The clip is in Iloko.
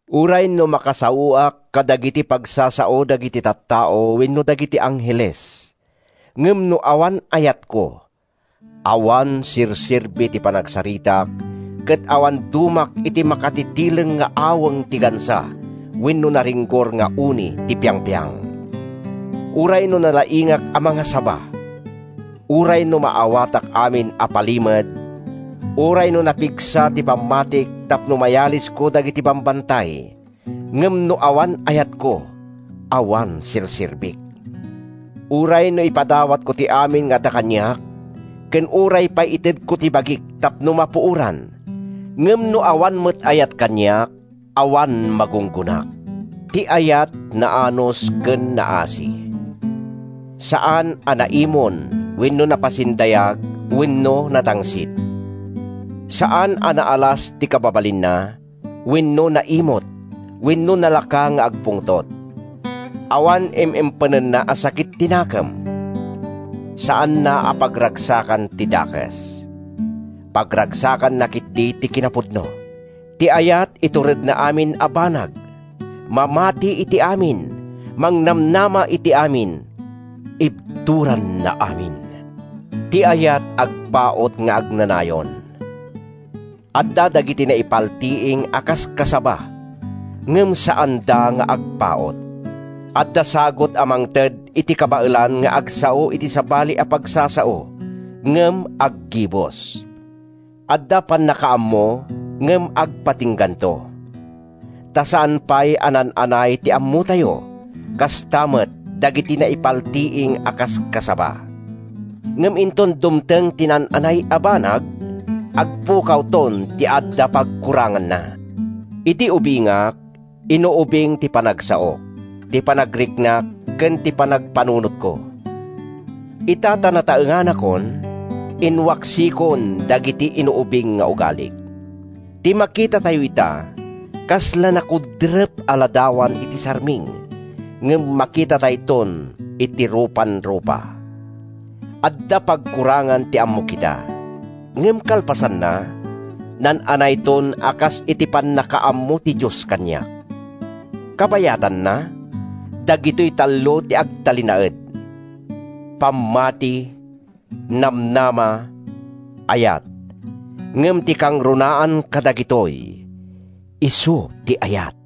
Uray no makasaoak kadagiti pagsasao dagiti tattao wenno dagiti angheles, ngem no awan ayatko, awan serserbi ti panagsaritak ket awan dumak iti makatitileng nga aweng ti gansa wenno naringgor nga uni ti piangpiang. Uray no nalaingak a mangasaba, uray no maawatak amin a palimed, uray no napigsa ti pammatik tapno mayalisko dagiti bambantay, ngem no awan ayatko, awan serserbik. Uray no ipadawatko ti amin nga adda kaniak, ken uray pay itedko ti bagik tapno mapuoran, ngem no awan met ayat kaniak, awan magunggonak. Ti ayat naanus ken naasi. Saan a naimon wenno napasindayag wenno natangsit. Saan a naalas ti kababalinna wenno naimut wenno nalaka nga agpungtot. Awan im-impenna a sakit ti nakem. Saanna a pagragsakan ti dakes. Pagragsakanna ketdi ti kinapudno. Ti ayat ituredna amin a banag, mamati iti amin, mangnamnama iti amin, ibturanna amin. Ti ayat agpaut nga agnanayon. Adda dagiti naipaltiing a kaskasaba, ngem saanda nga agpaut. Adda sagut a mangted iti kabaelan nga agsao iti sabali a pagsasao, ngem aggibus. Adda pannakaammo, ngem agpatingganto. Ta saan pay a naan-anay ti ammotayo, kasta met dagiti naipaltiing a kaskasaba. Ngem inton dumteng ti naan-anay a banag, agpukawton ti adda pagkuranganna. Idi ubingak, inuubing ti panagsaok, ti panagriknak ken ti panagpanunotko. Ita ta nataenganakon, inwaksikon dagiti inuubing nga ugalik. Ti makitatayo ita, kasla nakudrep a ladawan iti sarming, ngem makitatayton iti rupanrupa. Adda pagkurangan ti ammok ita, ngem kalpasanna, naan-anayton a kas iti pannakaammo ti Dios kaniak. Kabayatanna, dagitoy tallo ti agtalinaed: pammati, namnama, ayat; ngem ti kangrunaan kadagitoy, isu ti ayat.